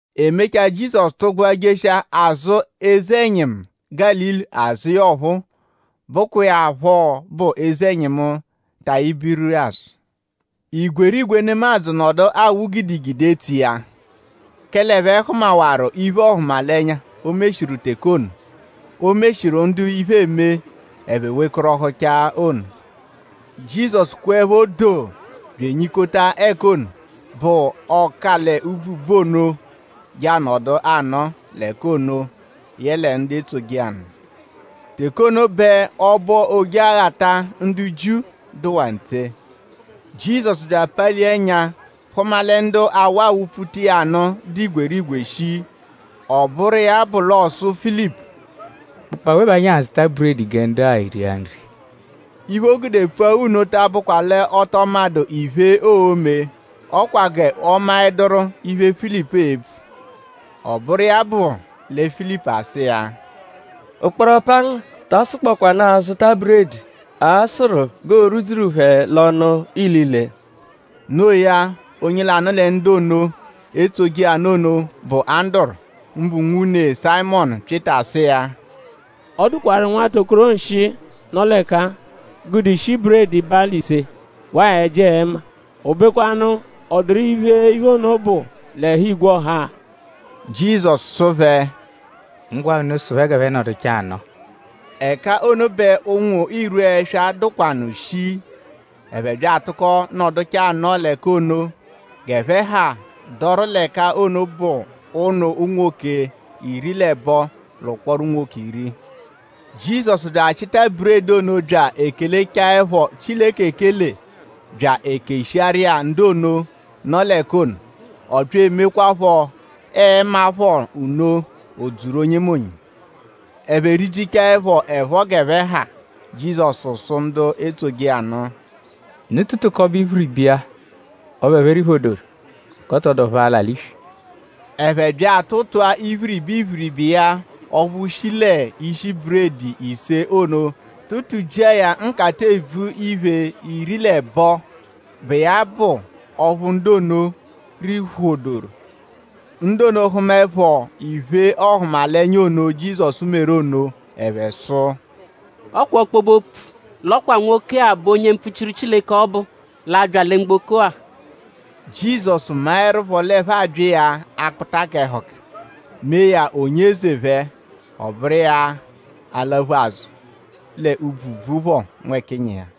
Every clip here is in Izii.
E mechaa; Jizọsu tụgbua jeshia azụ eze-ẹnyimu Gálili azụ iya ọphuu, bụkwa iya phọ bụ eze-ẹnyimu Tayibiriyasu. Igwerigwe nemadzụ nọdu awụ gidigidi etso iya; kẹle ẹphe hụmawaru iphe-ọhumalenya, o meshiru teke ono, o meshiru ndu iphe eme ẹphe wekọrohuchaa ono. Jizọsu kweẹpho doo bya enyikota ẹka ono, bụ ọ-ka-l'úbvú-úbvú ono je anọdu anọo l'ẹka ono yẹle ndu etsoje iya nụ. Teke ono bẹ ọbo Ojeghata ndu Jiu dụwaa ntse. Jizọsu bya apalia ẹnya; hụma lẹ ndu awụ abyapfuta iya nụ dụ igwerigwe shii. Ọ bụru iya bụ l'ọ sụ Filipu: “?Bụkpoo awe bẹ anyi a-zụta buredi gẹ ndu-a eria nri?” Iphe, o gude pfua nno ta abụkwa l'ọ tọ madụ iphe, oo-me. Ọ kwa g'ọ maẹduru iphe, Filipu e-pfu. Ọ bụru iya bụ lẹ Filipu asụ iya: “Ụkporo pangu taa sụkpokwanu azụta buredi, a-sụru g'oo-rwudzuru phẹ l'ọnu ilile.” Noo ya; onye lanụ lẹ ndu ono, etsoje iya nụ ono, bụ Anduru; mbụ nwune Sayịmonu Pyịta sụ iya: “Ọ dụkwaru nwata nwokoro nshịi, nọ l'ẹka-a, gude ishi buredi balị ise; waa ẹji-ẹma. O bekwanụ?ọ dụru iphe, iphe ono bụ l'ẹhu igwe ọha-a?” Jizọsu sụ phẹ: “Ngwa unu sụ phẹ g'ẹphe nọduchaa anọo.” Ẹka ono bẹ ụnwu irwu ẹswa dụkwanu shii. Ẹphe bya atụko nọduchaa anọo l'ẹka ono. G'ẹphe ha dọru l'ẹka ono bụ ụnu unwoke iri l'ẹbo l'ụkporo unwoke iri. Jizọsu bya achịta buredi ono bya ekelechaẹpho Chileke ekele bya ekeshiaru iya ndu ono, nọ l'ẹka ono. Ọ bya emekwaaphọ ẹma phọ nno; o dzuru onyemonye. Ẹphe rijichaẹpho ẹpho g'ẹphe ha; Jizọsu sụ ndu etsoje iya nụ: “Unu tụtukobe iphiriba iya ọphu ẹphe riphodoru g'ọ tọ dụ ọphu a-la l'iswi.” Ẹphe bya atụtua iphiriba iphiriba iya ọphu shi l'ishi buredi ise ono tụtu-jia ya nkata-evu-iphe iri l'ẹbo, bụ iya bụ ọphu ndu ono riphodoru. Ndu ono hụmaepho iphe ọhumalenya ono, Jizọsu meru ono ẹphe sụ: “Ọ kwa ọkpobe-opfu l'ọo nwoke-a bụ onye mpfuchiru Chileke ọbu, l'a-bya lẹ mgboko-a!” Jizọsu maẹrupho l'ẹphe abya iya akpụta k'ẹhuka; mee ya onye eze phẹ; ọ bụru iya alaphu azụ l'úbvú úbvú phọ nwẹkinyi iya.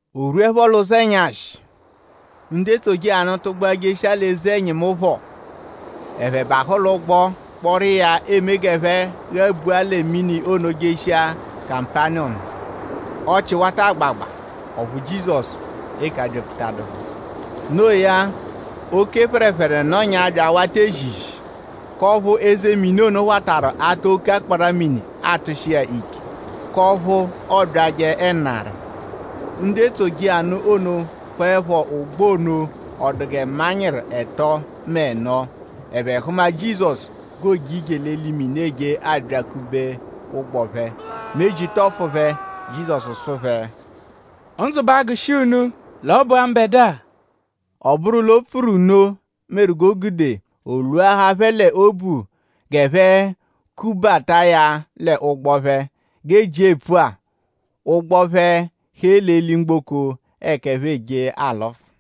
O rwuẹpho l'ụzo ẹnyashi; ndu etsoje iya nụ tụgbua jeshia l'eze-ẹnyimu phọ. Ẹphe bahụ l'ụgbo kpọru iya eme g'ẹphe ghabua lẹ mini ono jeshia Kapaniyọmu. Ọchii wata agbagba; ọphu Jizọsu 'eke abyapfutadu phẹ. Noo ya; oke phẹrephere nọnyaa bya awata ezizi; k'ọphu eze mini ono watarụ atụ oke akpara-mini atụshi iya ike; k'ọphu ọ byajẹ ẹnari. Ndu etsoje iya nụ ono kpọepho ụgbo ono ọ dụ gẹ manyịru ẹto mẹ ẹno; ẹphe hụma Jizọsu g'ooje ije l'eli mini eje abyakube ụgbo phẹ. Meji tọfu phẹ. Jizọsu sụ phẹ: “Ndzụ ba agụshi unu; l'ọ bụ-a mbẹdua.” Ọ bụru l'o pfuru nno meru g'o gude o lwuahaa phẹ l'obu g'ẹphe kubata iya l'ụgbo phẹ. G'ejia epfua; ụgbo phẹ hee l'eli-mgboko ẹka ẹphe eje alụfu.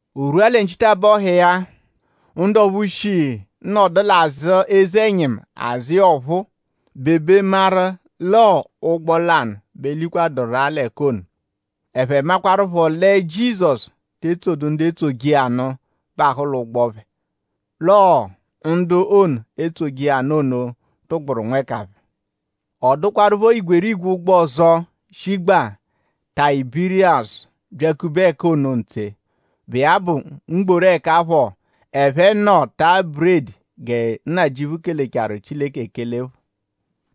O rwua lẹ nchitabọhu iya; ndu ọphu shi nọdu l'azụ eze-ẹnyimu azụ iya ọphuu bebe maru l'ọo ụgbo lanụ bẹ likwaduru-a l'ẹka ono. Ẹphe makwaruphọ lẹ Jizọsu te tsodu ndu etsoje iya nụ bahụ l'ụgbo phẹ; l'ọo ndu ono, etsoje iya nụ ono tụgburu nwẹka phẹ. Ọ dụkwarupho igwerigwe ụgbo ọzo, shigbaa Tayibiriyasu byakube ẹka ono ntse, bụ iya bụ mgboru ẹka phọ, ẹphe nọ taa buredi gẹ Nnajịuphu kelechaaru Chileke ekele phọ.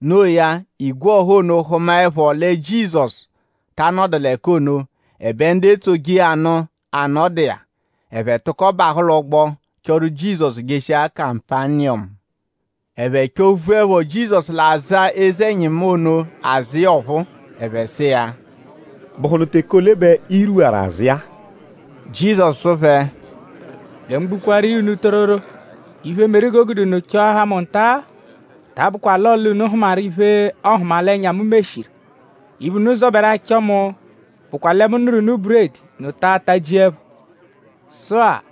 No iya; igwe ọha ono hụmaepho lẹ Jizọsu ta anọdu l'ẹka ono; ẹbe ndu etsoje iya nụ anọdu iya; ẹphe tụko bahụ l'ụgbo chọru Jizọsu jeshia Kapaniyọmu. Ẹphe chọ-vuẹpho Jizọsu l'azụ eze-ẹnyimu ono azụ iya ọphuu; ẹphe sụ iya: “?Bụhunu teke ole bẹ i rwuwaru azụ iya-a?” Jizọsu sụ phẹ: “Gẹ mu gbukwaaru iya unu tororo; iphe, meru g'o gude unu chọahaa mu nta-a ta abụkwa l'ọle unu hụmaru iphe-ọhumalenya, mu meshiru. Iphe, unu zọberu achọ mu bụkwa lẹ mu nụru unu buredi; unu taa tajia ẹpho. Sụ-a;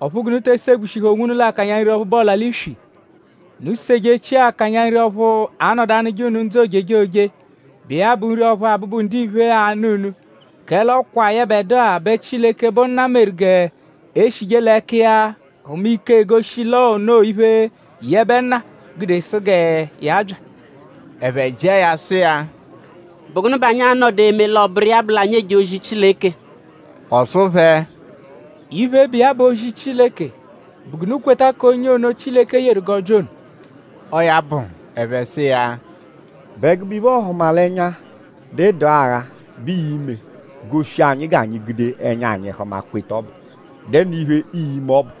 ọphu g'unu te segbushihẹ onwunu l'akanya nri ọphu bụ ọla-l'iswi. Unu sejechia akanya nri ọphu a-nọdu anụje unu ndzụ ojejoje, bụ iya bụ nri ọphu Abụbu-Ndiphe a-nụ unu; kẹle ọ kwa yẹbedua bẹ Chileke, bụ Nna meru g'e shije l'ẹka iya hụma ike, egoshi l'onoo iphe, yẹbe Nna gude sụ gẹ ya bya.” Ẹphe jịa ya sụ iya: “?Bụ gụnu bẹ anyi a-nọdu eme l'ọ bụru iya bụ l'anyi eje ozi Chileke?” Ọ sụ phẹ: “Iphe, bụ iya bụ ozi Chileke bụ g'unu kweta k'onye ono, Chileke yeru g'ọ bya ono.” Ọo ya bụ; ẹphe sụ iya: “?Bụ ẹgube iphe-ọhumalenya, dụ ịdu-agha bẹ ii-me goshi anyi g'anyi gude ẹnya anyi hụma kweta ọbu??Dẹnu iphe, ii-me ọbu?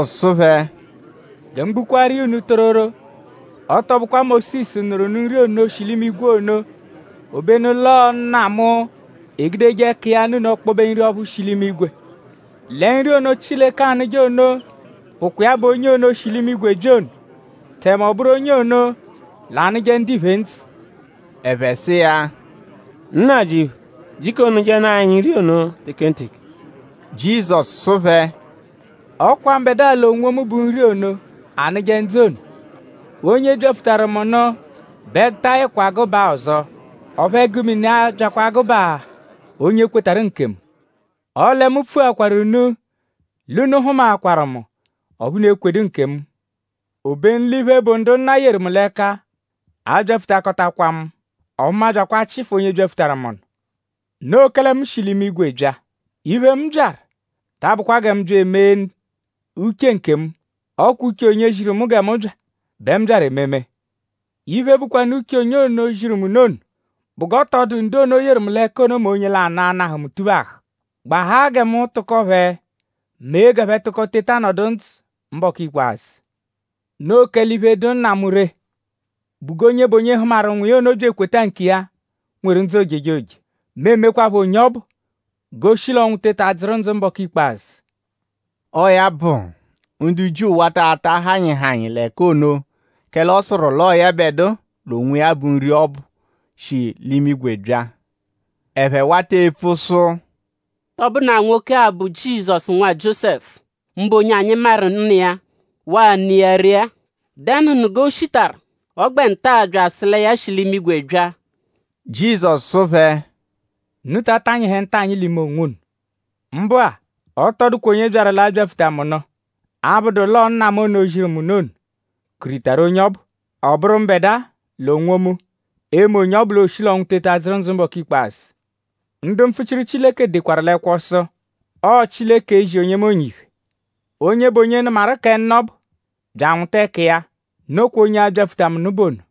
Jizọsu sụ phẹ: “Gẹ mu gbukwaaru iya unu tororo; ọ tọ bụkwa Mósisu nụru unu nri ono shi l'imigwe ono. Obenu l'ọo Nna mu egudeje ẹka iya nụ unu ọkpobe nri ọphu shi l'imigwe. Lẹ nri ono, Chileke anụje ono bụkwa iya bụ onye ono, shi l'imigwe bya ono; tẹme ọ bụru onye ono anụje ndiphe ndzụ.” Ẹphe sụ iya: “Nnajịuphu; jiko nụjenu anyi nri ono tekenteke.” Jizọsu sụ phẹ: “Ọ kwa mbẹdua l'onwomu bụ nri ono, anụje ndzụ ono. Onye byapfutaru mu nụ bẹ ẹgu ta ayịkwa gụbaa ọzo; ọphu ẹgu mini abyakwa agụbaa onye kwetarụ nkemu. Ọle mu pfuakwaru unu l'unu hụmaakwaru mu; ọphu unu ekwedu nkemu. Obenu l'iphe, bụ ndu Nna mu yeru mu l'ẹka a-byapfutakọtakwa mu; ọphu mu abyakwa achịfu onye byapfutaru mu nụ. Noo kẹle mu shi l'imigwe bya. Iphe, mu byaru ta abụkwa gẹ mu bya emee uche nkemu; ọ kwa uche onye ziru mu gẹ mu bya bẹ mu byaru ememe. Iphe, bụkwanu uche onye ono, ziru mu nụ ono bụ g'ọ tọ dụ ndu ono, o yeru mu l'ẹka ono mẹ onye lanụ, a-nahụ mu tuphahụ; gbahaa gẹ mu tụko phẹ mee g'ẹphe tụko teta nọdu ndzụ mbọku ikpazụ. Noo kẹle iphe, dụ Nna mu ree bụ g'onye bụ onye hụmaru Nwa iya ono bya ekweta nkiya nweru ndzụ ojejoje. Mu e-mekwaphọ onye ọbu g'o shi l'ọnwu teta dzụru ndzụ mbọku ikpazụ.” Ọo ya bụ; ndu Jiu wata ata hanyịhanyi l'ẹka ono; kẹle ọ sụru l'ọo yẹbedua l'onwiya bụ nri ọbu, shi l'imigwe bya. Ẹphe wata epfu sụ: “?Tọ bụnu-a nwoke-a bụ Jizọsu, nwa Jiósẹfu; mbụ onye anyi maru nna iya; waa ne iya ree-a??Dẹnuhunu g'o shitaru ọ gbẹ nta-a bya asụ lẹ ya shi l'imigwe bya?” Jizọsu sụ phẹ: Unu ta atanyịhe ntanyị l'ime onwunu. Mbụ-a; ọ tọ dụkwa onye byaru l'abyapfuta mu nụ; abụdu l'ọo Nna mu ono, ziru mu nụ ono kuritaru onye ọbu. Ọ bụru mbẹdua l'onwomu e-me onye ọbu l'ooshi l'ọnwu teta dzụru ndzụ mbọku ikpazụ. Ndu mpfuchiru Chileke dekwaru l'ẹkwo sụ: “Ọo Chileke e-zi onyemonye iphe.” Onye bụ onye nụmaru kẹ Nna ọbu; bya anwụta ẹka iya; nokwa onye a-byapfuta mu nụ bụ ono.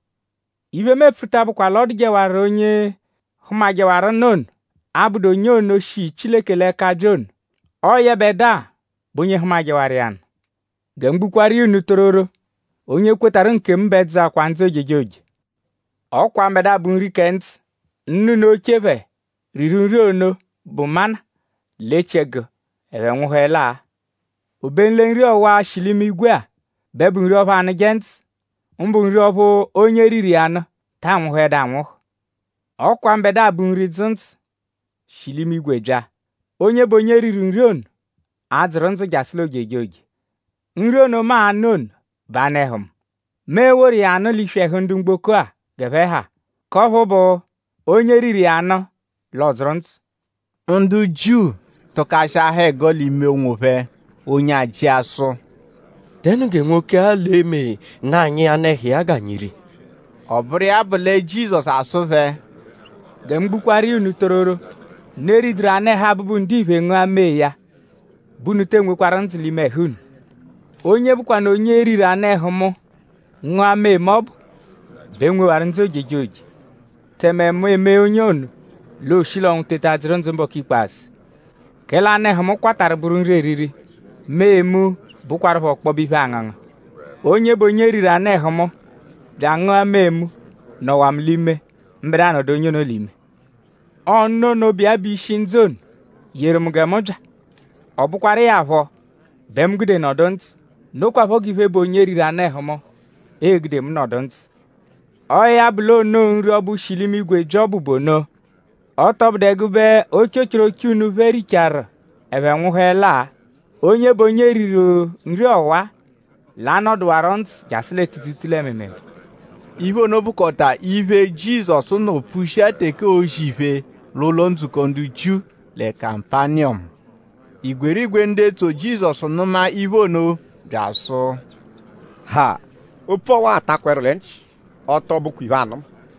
Iphe, mu epfu ta abụkwa l'ọ dụjewaru onye hụmajewaru Nna ono, abụdu onye ono, shi Chileke l'ẹka bya ono. Ọo yẹbedua bụ onye hụmajewaru iya nụ. Gẹ mu gbukwaaru iya unu tororo; onye kwetarụ nkemu bẹ dzụakwaa ndzụ ojejoje. Ọ kwa mbẹdua, bụ nri kẹ ndzụ. Nna unu oche phẹ riru nri ono, bụ mana l'echiẹgu; ẹphe nwụhuelaa. Obenu lẹ nri ọwa, shi l'imigwe-a bẹ bụ nri ọphu anụje ndzụ; mbụ nri ọphu onye riru iya nụ taa nwụhuedu anwụhu. Ọ kwa mbẹdua bụ nri, dzụ ndzụ; shi l'imigwe bya. Onye bụ onye riru nri ono a-dzụru ndzụ jasụ l'ojejoje. Nri ono, mu a-nụ ono bụ anụ-ẹhu mu. Mu e-woru iya nụ l'iswi ẹhu ndu mgboko-a g'ẹphe ha; k'ọphu bụ; onye riru iya nụ; l'ọ dzụru ndzụ. Ndu Jiu tụkashiahaa ẹgo l'ime onwophẹ. Onye ajị sụ:?Dẹnu gẹ nwoke-a l'e-me nụ anyi anụ-ẹhu iya g'anyi ria? Ọ bụru iya bụ lẹ Jizọsu asụ phẹ: “Gẹ mu gbukwaaru iya unu tororo; unu eriduru anụ-ẹhu Abụbu-Ndiphe; ngụa mee ya bẹ unu tee nwekwarụ ndzụ l'ime ẹhu unu. Onye bụkwanu onye riru anụ-ẹhu mu; ngụa mee mu ọbu; bẹ nwewaru ndzụ ojejoje; tẹme mu emee onye ono; l'ooshi l'ọnwu teta dzụru ndzụ mbọku ikpazụ. Kẹle anụ-ẹhu mu kwatarụ bụru nri eriri; mee mu bụkwarupho ọkpobe iphe-angụngu. Onye bụ onye riru anụ-ẹhu mu; bya angụa mee mu; nọwaa mu l'ime; mbẹdua nọdu onye ono l'ime. Ọo Nna ono, bụ iya bụ ishi ndzụ ono yeru mu gẹ mu bya; ọ bụkwaru iya phọ bẹ mu gude nọdu ndzụ; nokwaphọ g'iphe, bụ onye riru anụ-ẹhu mu e-gude mu nọdu ndzụ. Ọo ya bụ l'onoo nri ọbu, shi l'imigwe bya ọbu bụ ono. Ọ tọ bụdu ẹgube ochochoroche unu phẹ richaaru ẹphe nwụhuelaa. Onye bụ onye riru nri ọwa l'a-nọduwaro ndzụ jasụ lẹ tuutuutuu lẹ mịimiimii.” Iphe ono bụkota iphe, Jizọsu nọ pfushia teke oozi iphe l'ụlo-ndzukọ ndu Jiu lẹ Kapaniyọmu. Igwerigwe ndu etso Jizọsu nụma iphe ono bya asụ: “Ha! Opfu ọwa atakwa ẹru lẹ nchị. Ọ tọ bụkwa iphe anụma.”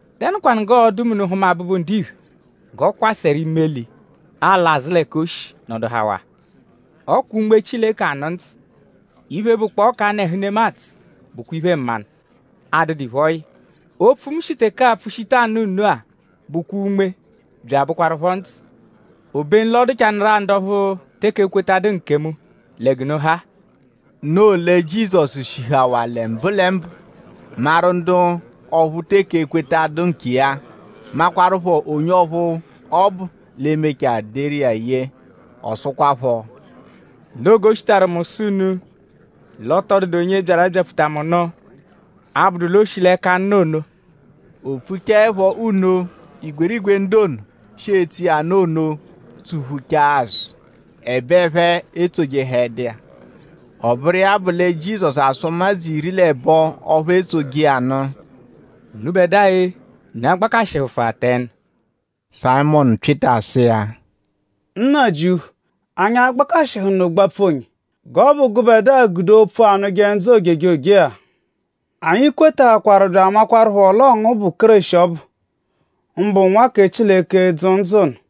?Dẹnukwanu g'ọo-du mẹ unu -hụma Abụbu-Ndiphe g'ọ kwasẹru imeli ala azụ l'ẹka o shi nọduhawaa? Ọ kwa Unme Chileke anụ ndzụ. Iphe, bụkpoo k'anụ-ẹhu nemadzụ bụkwa iphe-mmanụ, adụdu iphe, ọ yị. Opfu, mu shi teke-a pfushita anụ unu-a bụkwa unme bya abụkwarupho ndzụ. Obenu l'ọ dụchanuru-a ndu ọphu teke ekwetadu nkemu lẹ g'unu ha-a.” Noo lẹ Jizọsu shihawaa lẹ mbụlembu maru ndu ọphu teke ekwetadu nkiya; makwaruphọ onye ọphu ọbu l'e-mechaa deru iya ye. Ọ sụkwapho: Noo g'o shitaru mu sụ unu l'ọ tọ dụdu onye byaru abyapfuta mu nụ; abụdu l'o shi l'ẹka Nna ono. O pfuchaẹpho nno; igwerigwe ndu ono, shi etso iya nụ ono tsuphuchaa azụ; ẹbe ẹphe etsojẹhedu iya. Ọ bụru iya bụ lẹ Jizọsu asụ ụmadzu iri l'ẹbo ọphu etsoje iya nụ: “Unubẹdua-e;?Unu a-gbakashịhufua tẹnu?” Sayịmonu Pyịta sụ iya: “Nnajịuphu!?Anyi a-gbakashịhu gbapfuhụnu onye? G'ọ bụ gụbedua gude opfu, anụje ndzụ ojejoje-a. Anyi kwetaakwaru bya amaakwarụpho l'ọo ngu bụ Kéreshi ọbu mbụ Nwa kẹ Chileke, dzụ ndzụ ono.”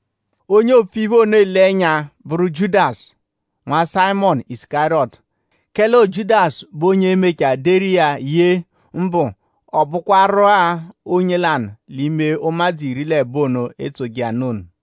Onye oopfu iphe ono ele ẹnya bụru Jiudasu, nwa Sayịmonu Isukariyọtu; kẹle ọo Jiudasu bụ onye e-mechaa deru iya ye; mbụ ọ bụkwaru-a onye lanụ l'ime ụmadzu iri l'ẹbo ono, etsoje iya nụ ono.